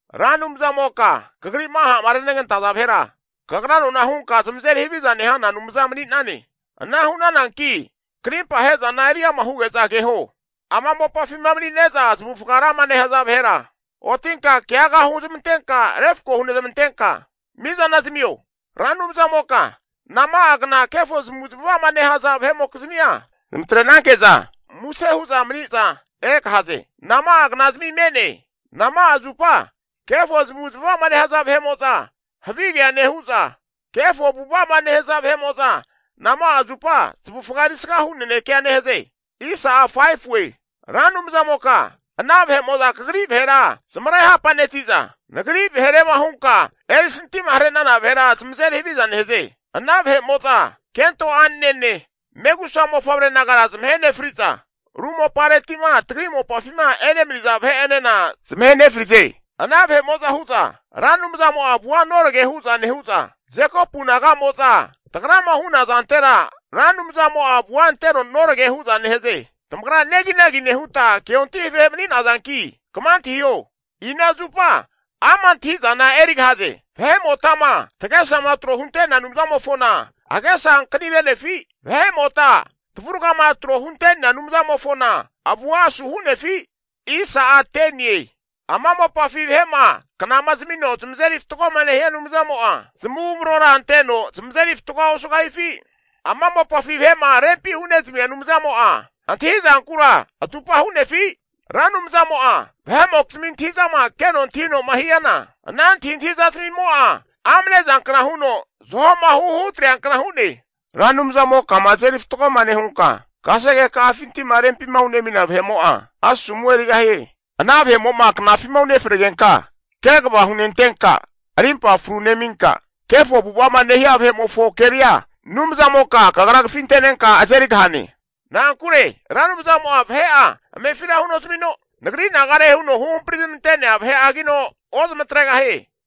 Ra Anumzamoka kagri'ma ha'ma renegantaza vahera, kagra nona hunka zamazeri haviza nehana Anumza mani'nane. Ana hu'nananki krimpa ahe'zana eriama huge'za keho. Ama mopafima mani'ne'za zamavufaga rama nehaza vahera, otinka keaga huzmantenka refko hunezmantenka mizana zamio. Ra Anumzamoka nama'agna kefo zamavu zamava'ma nehaza vahe'mokizmia zamatre'nanke'za musena huza maniza egahaze? Nama'a knazami me'ne? Nama'a zupa kefo zamavu zamava'ma nehaza vahe'mo'za havigea nehu'za, kefo avu'ava'ma nehaza nama'a zupa zamavufaga erisga hu nanekea nehaze? Ra Anumzamoka ana vahe'mo'za kagri vahera zamare hapa'neti'za, Nagri vaherema hunka erisantima hare'nana vahera zamazeri haviza nehaze. Ana vahe'mo'za kento a'nene megusa mofavre nagara zamahe nefri'za, ru mopareti'ma tagri mopafima emani'naza vahe'enena zamahe nefrize. Ana vahe'mo'za hu'za Ra Anumzamo'a avua norage hu'za nehu'za, Jekopu naga'mo'za tagrama hu'na zantera Ra Anumzamo'a avua anteno norage hu'za nehaze. Tamagra neginagi nehuta keontahi vahe mani'nazanki kama antahiho, ina zupa ama' antahi'zana erigahaze? Vahe'motama tagesama tro hunte'nea Anumzamofona agesa ankani re'nefi? Vahe'mota tavuragama tro hunte'nea Anumzamofona, avua asuhu'nefi? Ama mopafi vahe'ma knama zamino zamazeri fatgoma nehia Anumzamo'a, zamavumrora anteno zamazeri fatgoa osugahifi? Ama mopafi vahe'ma rempi hunezamia Anumzamo'a antahi'zankura atupa hu'nefi? Ra Anumzamo'a vahe'mokizmi antahi'zama keno antahino'ma hiana, ana antahintahizmimo'a amnezankna huno zahoma huhu hutreankna hu'ne. Ra Anumzamokama azeri fatgoma nehunka kasege ka'afinti'ma rempima hunemina vahe'mo'a asomu erigahie. Ana vahemo'ma knafima unefregenka, kegava hunentenka arimpa fru neminka, kefo avu'ava'ma nehia vahe'mofo keria Anumzamoka kagra kafintenenka azerigahane. Na'ankure Ra Anumzamo'a vahe'a amefira hunozamino, nagri nagare huno huhampari zamante'nea vahe'agino ozamatregahie.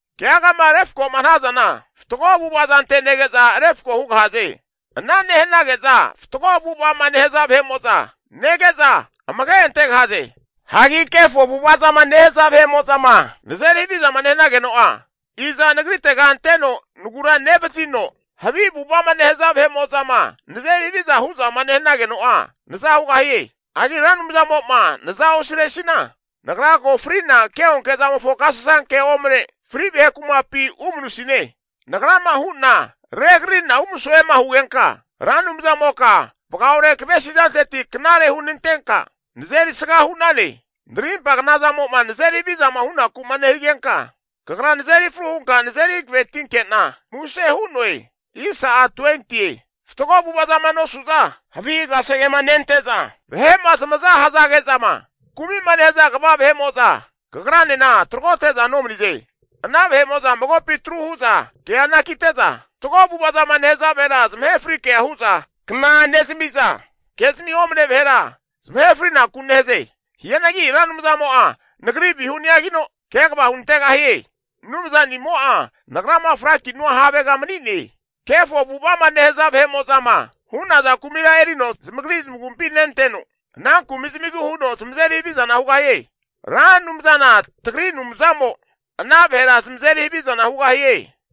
Keagama refko'ma hanazana, fatgo avu'ava zante nege'za refko hugahaze. Ana nehanage'za fatgo avu'ava'ma nehaza vahe'mo'zama nege'za amage antegahaze. Hagi kefo avu'ava'ma nehaza vahe'mo'zama nazeri havizama nehanageno'a, iza nagritega anteno nagura nevazino, havi avu'ava'ma nehaza vahe'mo'zama nazeri haviza hu'zama nehanageno'a naza hugahie? Hagi Ra Anumzamo'ma naza osiresina, nagra ko fri'na keonke zamofo agasasankema omne fri vahe kumapi umanusine. Nagrama hu'na regarari'na umasoema hugenka, Ra Anumzamoka vagaore kavesi zanteti knare hunantenka nazerisga hu'nane. Narimpagna zamo'ma nazeri havizama hunaku'ma nehigenka, Kagra nazeri fru hunka nazeri hankavetinke'na, muse hu'noe. Fatgo avu'ava zama nosu'za, havi kasegema nente'za, vahe'ma zamaza hazage'zama kumi'ma nehaza kva vahe'mo'za Kagranena taragote'za nomanize. Ana vahe'mo'za magopi atru hu'za kea anakite'za, fatgo avu'ava zama nehaza vahera zamahe frikea hu'za kna nezami'za, ke'zami omane vahera zamahe frinaku nehaze. Hianagi Ra Anumzamo'a nagri vihuni'agino kegava hunantegahie. Anumzanimo'a nagrama frakinua havega mani'ne. Kefo avu'ava'ma nehaza vahe'mo'zama hu'naza kumira erino zamagri zamagumpi nenteno, ana kumi zamigu huno zamazeri havizana hugahie. Ra Anumzana tagri Anumzamo ana vahera zamazeri havizana hugahie.